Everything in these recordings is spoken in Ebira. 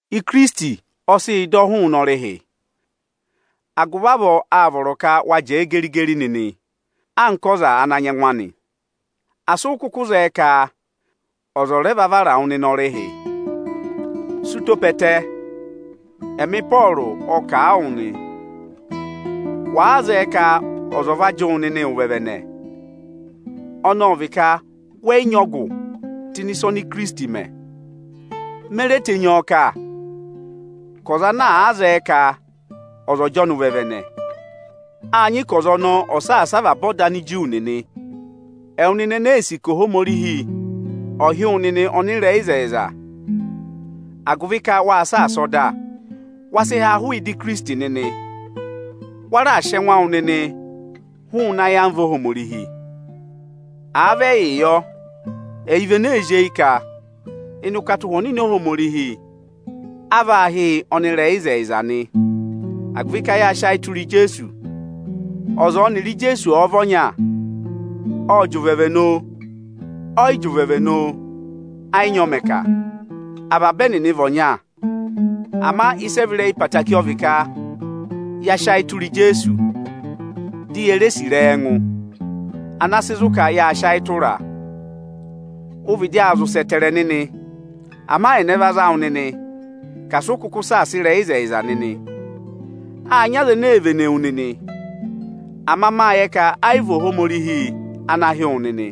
Ikirisiti ọ sị yị dọ hụụnị ọrịhị, agụvị avọọ, áa vọrọ ka wa jẹẹ geri-geri nịnị anka ọza ana nyị ẹngụ anị. Asị ụ kụkụ zẹẹ ka ọza ọ va vara wụ nịnị ọrịhị. Sị ụtọ pe ẹtẹ, ẹmị Ịpọọrụ aa kà a wụ nịnị nị, wàa zẹẹ ka ọza ọ̀ va jị wụ nịnị ụvẹvẹnẹ, ọnị ọ vị ka wẹ yị nyị tụ́ ịnị ịsa oni Ikirisiti mẹ nịnị. Me re tenyi ọ kà ka ọza ana àa zẹẹ ka ọza ọ̀ jị ọnị ụvẹvẹnẹ, áa nyị ka ọza ọnọọ ọ̀ọ saasa avaba ọda Aniju nịnị. Ẹwụ nịnị ene ee sì ka Ohomorihi ọ̀ hị́ wụ nịnị ọnịrẹyịzẹyịza agụvị ka waa saasa ọda, wa sị há hụụ ịdị Ikirisiti nịnị. Wa raà sị ẹngụ awụ nịnị hụụnị ayamva Ohomorihi. Àa vị ẹyịị yọ, ẹyị vị ene ee zí eyi ka ịnị ụkata Ụhwẹ Ọnịnị Óhomorihi vaa hị́ yị ọnịrẹyịzẹyịza nị. Agụvị ka yáa sị ayị tụra Ijeesu. Ọza ọnịrị Ijeesu ọ̀ọ vị ọnya, ọ̀ọ jị ụvẹvẹnẹ oo, ọ̀yị jị ụvẹvẹnẹ oo, ẹ yị nyị ọ mẹ̀ kà; avaba ẹnịnị vị ọnya. Ama ịsị ẹ vị ịrẹyị ẹtẹẹtẹrẹ ọ vị ka ya sị ayị tụra Ijeesu, di ye re sì ịrẹyị ẹngụ, ana sị zụ̀ ka yáa sị ayị tụraa. Ụ vịdị aa zị ụsẹ ẹtẹẹrẹ nịnị, ama ẹnẹ va za wụ nịnị ka asị ụ kụkụ saasa ịrẹyịzẹyịza nịnị? Áa nyị aza ene ee vene wu nịnị, ama máa yẹ ka ayị vị Ohomorihi ana hị́ wụ nịnị.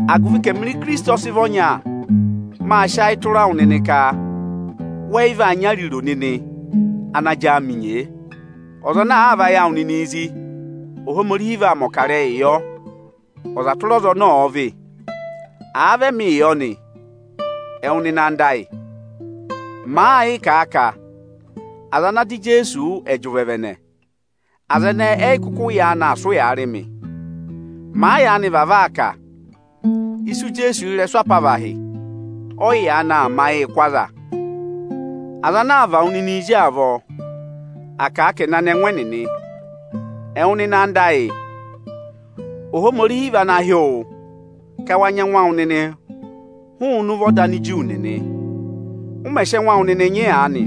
Agụvị ka ẹmịrị Ikirisiti ọ sị vị ọnya, máa sị ayị tụra wụ nịnị ka wẹ yị vaa nyị ariro nịnị ana jị áamị nyee. Ọza ana àaa và ayị awụ nịnịị zí, Ohomorihi vaa mẹ̀ ọkarẹyị yọ, ọza tụra ọza ọnị ọọ vị. Àa vị ẹmịị yọ nị, ẹwụ nịnị anda ayị, màa yịị kà a ka aza ana dọ Ijeesu wụ́, ẹ̀ jị ụvẹvẹnẹ, aza ẹnẹẹ ẹyị kụkụ yaanị aa sị ụyaa rị mị. Màa yaanị vavọọ aa kà, isu Ijeesu ị́rẹsụ apavahị ọyị yaanị aa mẹ ayịị kụ́ aza. Aza ana àaa và wụ nịnịị zí avọọ, à kà ka ẹ̀ na nị ẹngụ ẹnịnị. Ẹwụ nịnị anda ayị, Ohomorihi vị ana hị́ wụ ka wa nyị ẹngụ awụ nịnị (hụụnị ụvọ ọda Aniju nịnị). Ụ mẹ̀ sị ẹngụ awụ nịnị nyị aanị,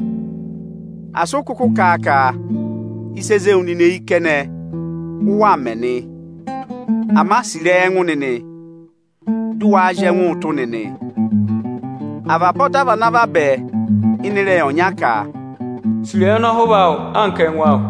asị ụ kụkụ kà a ka ịsị e zé wu nịnị eyi kẹnẹ, ụ waa mẹ nị. Ama sì ịrẹyị ẹngụ nịnị, dị waa zị ẹngụ ụtụ nịnị! Avaba ọda vị ana a vabẹ ịnị ịrẹyị ọnya ka, “Sì ịrẹyị ọnọhụva awụ anka ẹngụ awụ.”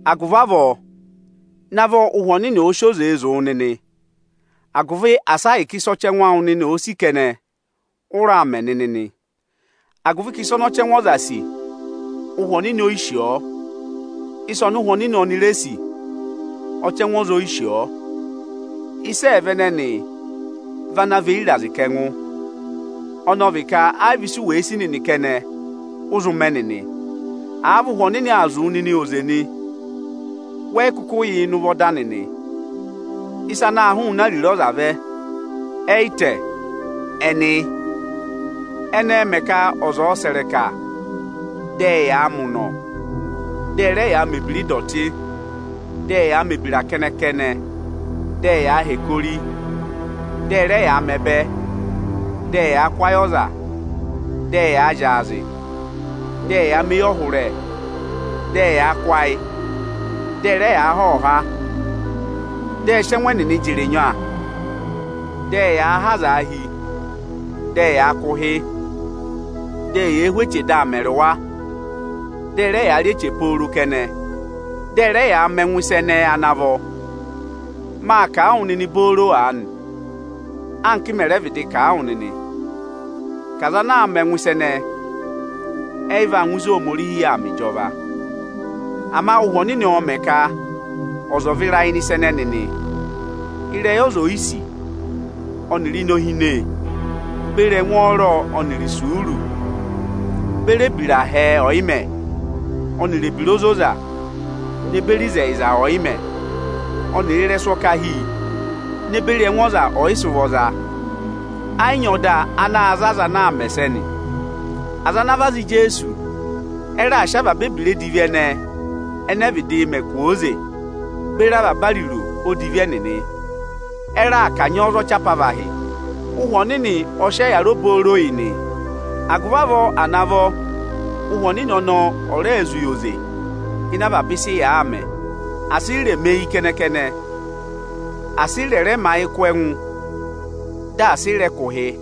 Agụvị avọọ, navọ Ụhwẹ Ọnịnị ọ̀ọ sị oze zụ̀ wụ nịnị, agụvị asị ahịka ịsị ọchẹngụ awụ nịnị òo sì kẹnẹ, ụ raa mẹ nịnị nị! Agụvị ka ịsa ọnị ọchẹngụ ọza sì, Ụhwẹ Ọnịnị oyi sì ọọ, ịsa ọnị Ụhwẹ Ọnịnị oni re sì, ọchẹngụ ọza oyi sì ọọ. Ịsa ẹẹva ẹnẹnị vị ana và eyi ịrazị kà ẹngụ; ọnị ọ vị ka ayị vị isu wèe sì nịnị kẹnẹ, ụ zụ mẹ nịnị. Àa vị Ụhwẹ Ọnịnị aa zụ̀ wụ nịnị oze nị, wẹ yị kụkụ yà ịnị ụvọ ọda nịnị. Ịsa anaā hụụnị ariro ọza vẹ, ẹyị tẹ, ẹnị yị: ẹnị ẹẹ̄ mẹ ka aza ẹ̀ẹ sẹ̀ ịrẹka dị ẹyaa mẹ ụnọ, dị ẹ rẹ yaa mẹ̀ ebira ịdọtị, dị ẹyaa mẹ̀ ebira kẹnẹ-kẹnẹ; dị ẹyaa hẹkẹ ori, dị ẹ rẹ yaa mẹ ẹbẹ, dị ẹyaa kụ́ ayị ọza, dị ẹyaa zyaazị, dị ẹyaa mẹ eyọhụrẹ, dị ẹyaa kụ́ ayị, dị ẹ rẹ yaa há ọhọha, dị ẹ sị ẹngụ ẹnịnị jị ịrịnya, dị ẹyaa há azaa hi, dị ẹyaa kụ̀ ụhị, dị eyee hú eche dị aa mẹrị wa; dị ẹ rẹ yaa rị eche pooro kẹnẹ; dị ẹ rẹ yaa mẹ ẹngụ ịsa ẹnẹẹ ana vọ. Maa kà a wụ nịnị booro aanị, anka m mẹ̀ rẹ vịdị kà a wụ nịnị, ka aza ana àa mẹ ẹngụ ịsa ẹnẹẹ, ẹyị va ngụ ịzị Ohomorihi yà aa mẹ ịjọva. Ama Ụhwẹ Ọnịnị ọọ̄ mẹ̀ ka ọza ọ̀ọ vịra ịnị ịsa ẹnẹnị nị: ịrẹyị ọza oyisì ọnịrị inohine beri ẹngwọọrọ ọnịrị isuuru beri ebira hẹẹ ọyịmẹ̀ ọnịrị ebira ozoza ne beri ịzẹyịza ọyịmẹ̀ ọnịrị ịrẹsụ ọkahi ne beri ẹngụ ọza ọyịsị ụvọ za. Ẹ yị nyị ọda ana za aza ana aa mẹ ẹsẹnị. Aza ana vị aza Ijeesu ẹ raà sị avaba ebira edivi ẹnẹẹ ẹnẹ ẹ vịdịị mẹ kwooze beri avaba ariro odivi ẹnịnị; ẹ raà kanyị ọọ za ọchị apavahị. Ụhwẹ Ọnịnị ọ sị ọyịyara obooro yị nị. Agụvị avọọ à navọ Ụhwẹ Ọnịnị ọnọọ ọ̀ rẹẹ zụ̀ yị oze ịnị avaba ịsị yàa mẹ. Asị ị rẹ̀ mẹ eyi kẹnẹ-kẹnẹ, asị ị rẹ̀ rẹ mẹ ayị kụ́ ẹngụ, dị asị ị rẹ̀ kụ̀ ụhị!